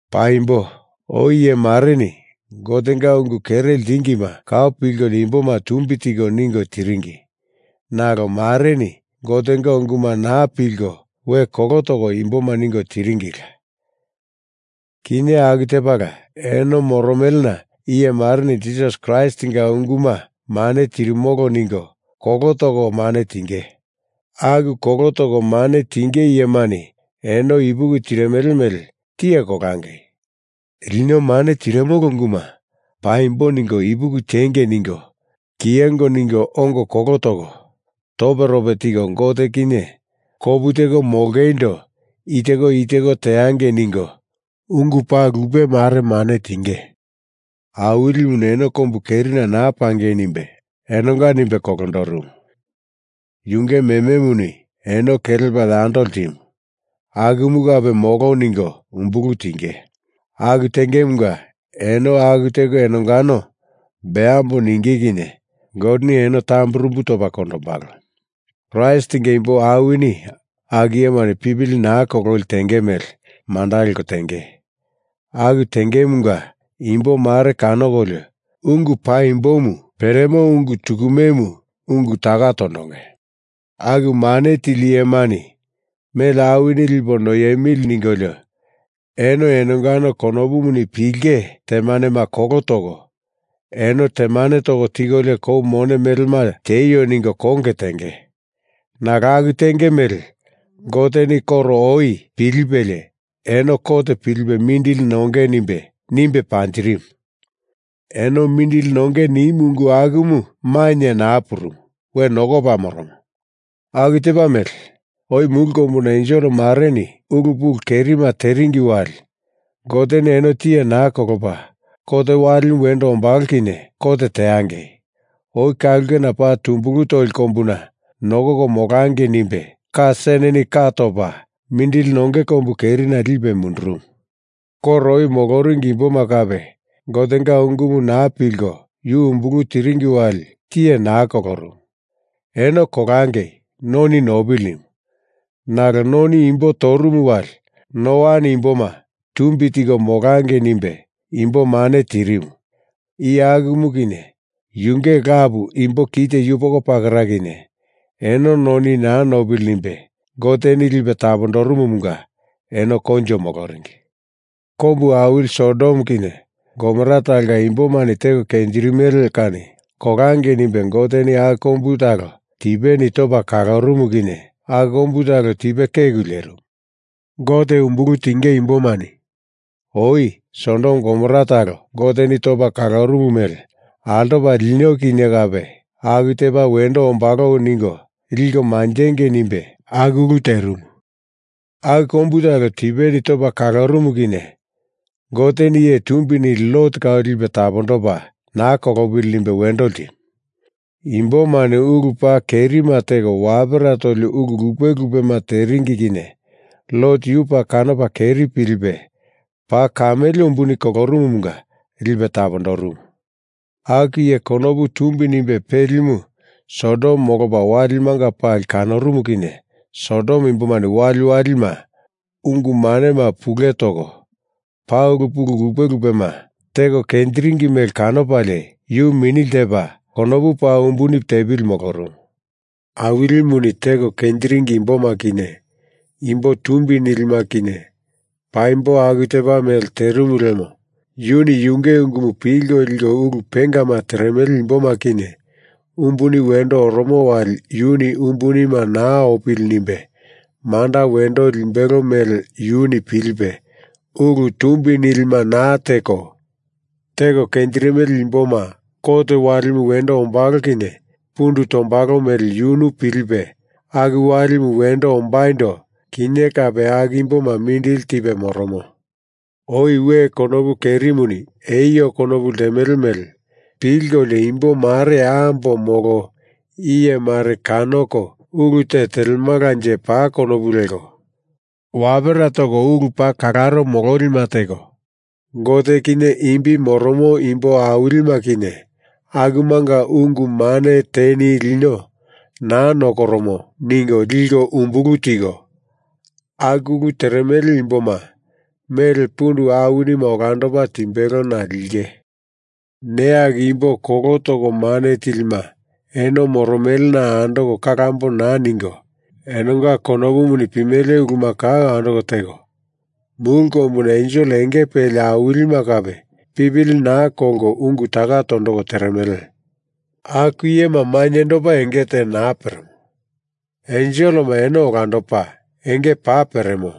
Paimbo oi iye mareni Gotenga ungu kere ltingima kau pilkolio imboma tumbi tiko ningo tiringi nalo mareni Gotenga unguma naa pilko we kolo toko imboma ningo tiringila. Kinye aku tepala eno moromelena iye mareni Jisas Kraistinga unguma mane tirimolo ningo kolo toko mane tinge. Aku kolo toko mane tinge iyemani eno ipuki tirimele mele tiye kolangei. Lino mane tirimolo unguma paimbo ningo ipuki tiengei ningo kiyengo ningo ongo kolo toko toperope tiko Gote kinye kopu teko molongeindo i teko i teko teangei ningo ungu paa lupe mare mane tinge. Awilimuni eno kombu kerina naa pangei nimbe enonga nimbe kolondorumu, yunge mememuni eno kelepa yando ltimu akumu kape molo ningo umbulu tinge. Aku tengemunga eno aku teko enongano beambo ninge kinye Goteni eno tamburumbu topa kondombalo. Kraistinga imbo awinini aku iyemani pipili naa kololi tenge mele manda leko tenge. Aku tengemunga imbo mare kanokolio ungu paimbomu peremo ungu tukumemu ungu taka tondonge. Aku mane tili iyemani mele awini lipo noiemili ningolio eno enongano konopuni pilinge temanema kolo toko, eno temane toko tikolio kou mone melema tieio ningo konge tenge. Nalo aku tenge mele Goteni koro oi pilipelie eno kot pilipe mindili nonge nimbe, nimbe panjirimu. Eno mindili nonge nimu ungu akumu mainye naa purumu. We nokopa moromo. Aku tepa mele, oi mulu kombuna ensel mareni ulu pulu kerima teringi wali Goteni eno tiye naa kolopa, kot walimu wendo ombalo kinye kot teangei, oi ka ulke paa tumbulu toli kombuna nokoko molangei nimbe ka seneni ka topa mindili nonge kombu kerina lipe mundurumu. Koro oi moloringi imboma kape Gotenga ungumu naa pilko yu umbulu tiringi wali tiye naa kolorumu. Eno kolangei noni nopili nimu. Nalo noni imboma torumu wali Noani imboma tumbi tiko molangei nimbe imboma mane tirimu iye akumu kinye yunge lapu imbo kite yupoko pakera kinye, eno noni naa nopili nimbe Goteni lipe tapondorumumunga eno koinjo moloringi. Kombu awili Sodom kinye Gomora talonga imboma teko kenjirimele kani kolangei nimbe Goteni aku kombu talo tipeni topa kalorumu kinye aku kombu talo tipe keku lierimu. Gote umbulu tinge imbomani oi Sodom Gomora talo Goteni topa kalorumu mele altopo lino kinye kape aku tepa wendo ombalo ningo liko manjengei nimbe aku ulu terimu. Aku kombu talo tipeni topa kalorumu kinye Goteni iye tumbi nili Lot kau lipe tapondopa naa kolopili nimbe wendo ltimu. Imbomani ulu paa kerima teko wapera toli ulu lupe lupema teringi kinye Lot yu paa kanopa keri pilipe paa kamele umbuni kolorumumunga lipe tapondorumu. Aku iye konopu tumbi nimbe pelimu Sodom molopa walimanga pali kanorumu kinye Sodom imboma waliwalima ungu manema pule toko paa ulu lupe lupema teko kenjiringi mele kanopalie yu mini ltepa konopu paa umbuni tepili molorumu. Awilimuni teko kenjiringi imboma kinye imbo tumbi nilima kinye paimbo aku tepa mele terimu lemo yuni yunge ungumu pilko liko ulu pengama teremele imboma kinye umbuni wendo oromo wali yuni umbuni naa opili nimbe manda wendo limbelo mele yunu pilipe, ulu tumbi nilima naa teko, teko kenjirimele imboma kot walimu wendo ombalo kinye pundu tombalo mele yunu pilipe, aku walimu wendo ombaindo, kinye kape aku imboma mindili tipe moromo. Oi we konopu kerimuni eio konopu ltemele mele pilkolio imbo mare ambo molo iye mare kanoko ulu te telemalanje paa konopu leko, wapera toko ulu paa kalaro mololima teko, Gote kinye imbi moromo imbo awilima kinye akumanga ungu mane teni lino naa nokoromo ningo liko umbulu tiko, aku ulu teremele imboma mele pundu awinima olandopa timbelona linge. Neya aku imbo kolo toko mane tilima eno moromelena andoko kalambo naa ningo, enonga konopumuni pimele uluma kau andoko teko, mulu kombuna ensel enge peli awilima kape pipili naa kolko ungu taka tondoko teremele. Aku iyema mainyendopa, enge te naa peremo, enselema eno olandopa, enge paa peremo,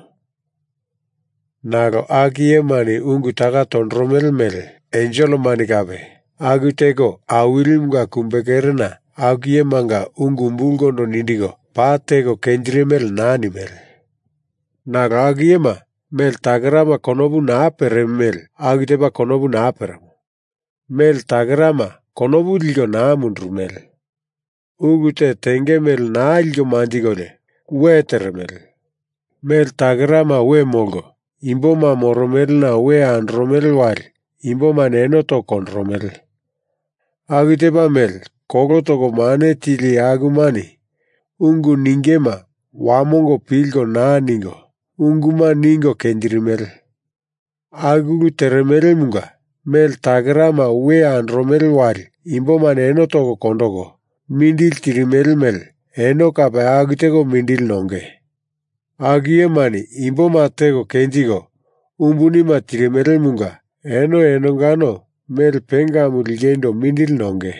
nalo aku iyemani ungu taka tondoromele mele enselemani kape aku teko Awilimunga kumbekerena aku iyemanga ungu umbulkondo nindiko paa teko kenjirimele naa nimele. Nalo aku iyema, mele takerama konopu naa peremo mele, aku tepa konopu naa peremo. Mele takerama konopu liko naa mundurumele. Ulu te tenge mele naa liko manjikolio we teremele. Mele takerama we molko, imboma moromelena we andoromele wali imbomani eno toko kondoromele. Aku tepa mele kolo toko mane tili iye akumani ungu ningema wamongo pilko naa ningo, unguma ningo kenjirimele. Aku ulu teremelemunga mele takerama we andoromele wali imbomani eno toko kondoko mindili tirimele mele eno kape aku teko mindili nonge. Aku iyemani imboma teko kenjiko umbunima tirimelemunga eno enongano mele pengamu lingeindo mindili nonge.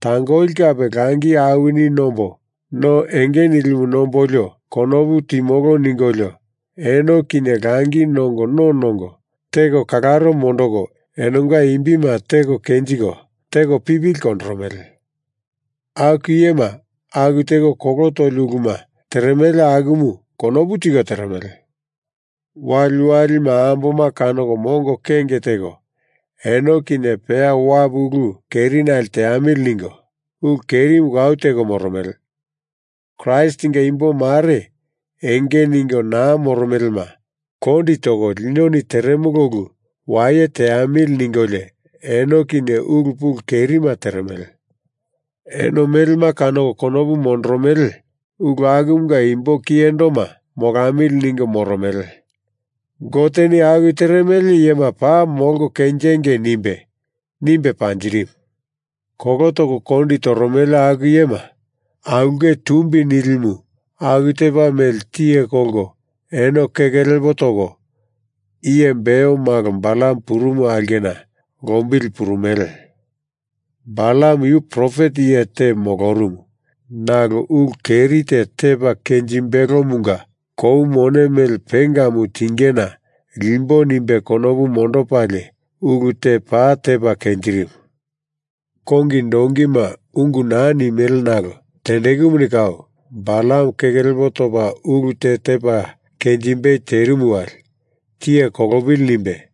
Tangoli kape langi awini nombo no enge nilimu nombolio konopu timolo ningolio, eno kinye langi nongo no nongo, teko kalaro mondoko enonga imbima teko kenjiko, teko pipili kondoromele. Aku iyema aku teko kolo toli uluma teremele akumu konopu tiko teremele. Waliwalima amboma kanoko mongo kenge teko eno kinye peya wapu ulu kerinali teamili ningo, ulu kerimu kau teko moromele. Kraistinga imbo mare enge ningo naa moromelema kondi toko linoni teremolo ulu waye teamili ningolio eno kinye ulu pulu kerima teremele. Eno melema kanoko konopu mondoromele ulu akumunga imbo kiyendoma molamili ningo moromele. Goteni aku teremele iyema paa molko kenjingei nimbe, nimbe panjirimu. Kolo toko kondi toromele aku iyema aulke tumbi nilimu aku tepa mele tiye kolko eno keke lepo toko, iye Beor malo Balam purumu aulkena lombili purumele. Balam yu profet iye te molorumu nalo ulu keri te tepa kenjimbelomunga kou mone mele pengamu tingena limbo nimbe konopu mondopalie ulu te paa tepa kenjirimu. Kongi donkima ungu naa nimele nalo tendekumuni kau, Balam keke lepo topa ulu te tepa kenjimbei terimu wali, tiye kolopili nimbe,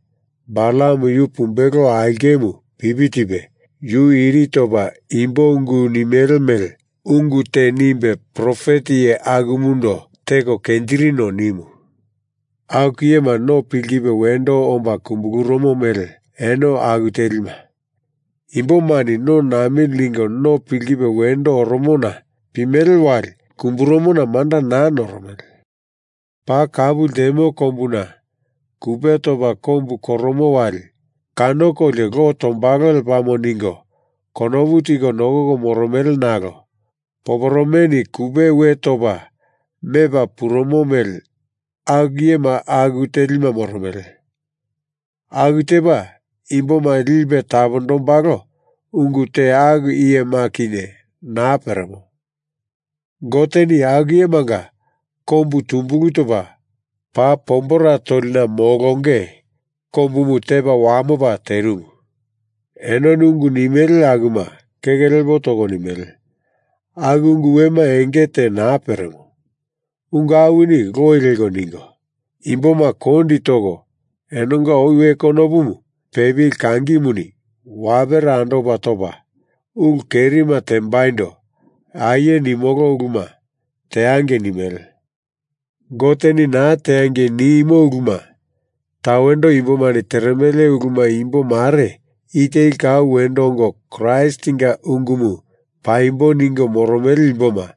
Balam yu pumbelo aulkemu pipi tipe, yu iri topa imbo ungu nimele mele ungu te nimbe profet iye akumundo teko kenjirino nimu. Aku iyema no pikipe wendo omba kumbulurumo mele eno aku telima. Imbomani no namili ningo no pikipe wendo oromona pimele wali kumburumona manda naa noromele. Paa kapu ltemo kombuna kupe topa kombu koromo wali kanokolio lo tombalo lepamo ningo konopu tiko nokoko moromele nalo poporomeni kupema we topa mepa purumo mele aku iyema aku telima moromele. Aku tepa, imboma lipe tapondombalo ungu te aku iyema kinye naa peremo. Goteni aku iyemanga kombu tumbulu topa paa pombera tolina molonge kombumu tepa wamopa terimu. Enoni ungu nimele akuma keke lepo toko nimele, aku ungu wema enge te naa peremo. Ungu awini loi leko ningo, imboma kondi toko enonga oi we konopumu pepili kangimuni wapera andopa topa, ulu kerima tembaindo aie nimolo uluma teangei nimele. Goteni naa teangei nimo uluma tawendo imbomani teremele uluma imbo mare i teli kau wendo ongo Kraistinga ungumu paimbo ningo moromele imboma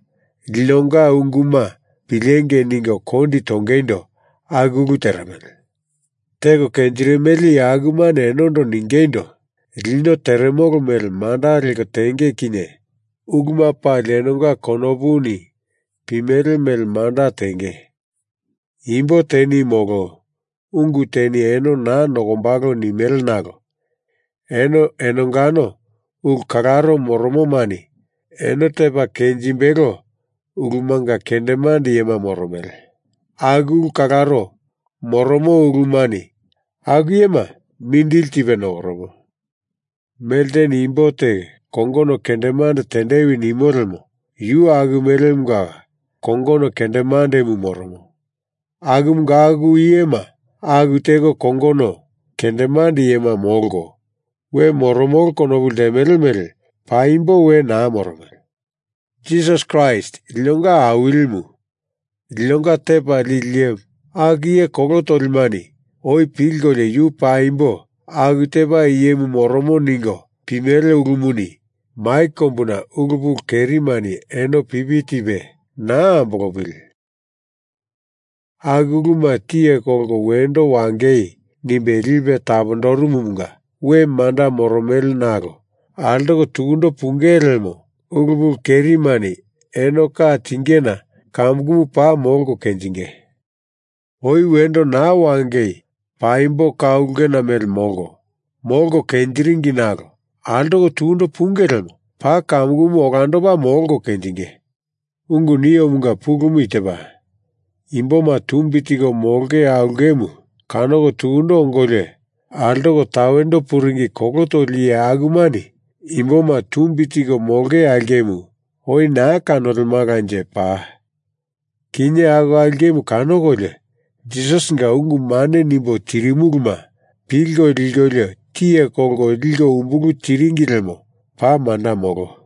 linonga unguma pilengei ningo kondi tongeindo aku ulu teremele. Teko kenjirimele iye akumani enondo ningeindo, lino teremolo mele manda leko tenge kinye uluma pali enonga konopuni pimele mele manda tenge. Imbo teni molo ungu teni eno naa nokombalo nimele nalo eno enongano ulu kalaro moromomani eno tepa kenjimbelo ulumanga kendemande iyema moromele, aku ulu kalaro moromo ulumani aku iyema mindili tipe nokoromo. Melteni imbo te kongono kendemande tendewi nimo lemo yu aku melemunga kongono kendemandemu moromo. Akumunga aku iyema aku teko kongono kendemande iyema molko, we moromolo konopu ltemele mele paimbo we naa moromele. Jisas Kraist, linonga Awilimu, linonga Tepa Lili Iyemu, aku iye kolo tolimani oi pilkolio yu paimbo aku tepa iyemu moromo ningo pimele ulumuni mai kombuna ulu pulu kerimani eno pipi tipe naa ambolopili, aku uluma tiye kolko wendo wangei nimbe lipe tapondorumumunga we manda moromele nalo altoko tukundo punge lemo ulu pulu kerimani eno ka tingena kamukumu paa molko kenjinge. Oi wendo naa wangei paimbo ka ulkena mele molko, molko kenjiringi nalo altoko tukundo punge lemo paa kamukumu olandopa molko kenjinge. Ungu niomunga pulumu i tepa: Imboma tumbi tiko molonge aulkemu kanoko tukundo ongolio altoko tawendo puringi kolo toli iye akumani imboma tumbi tiko molonge aulkemu oi naa kanolemalanje paa. Kinye aku aulkemu kanokolio, Jisasinga ungu mane nimbo tirimuluma pilko likolio tiye kolko liko umbulu tiringi lemo paa manda molo.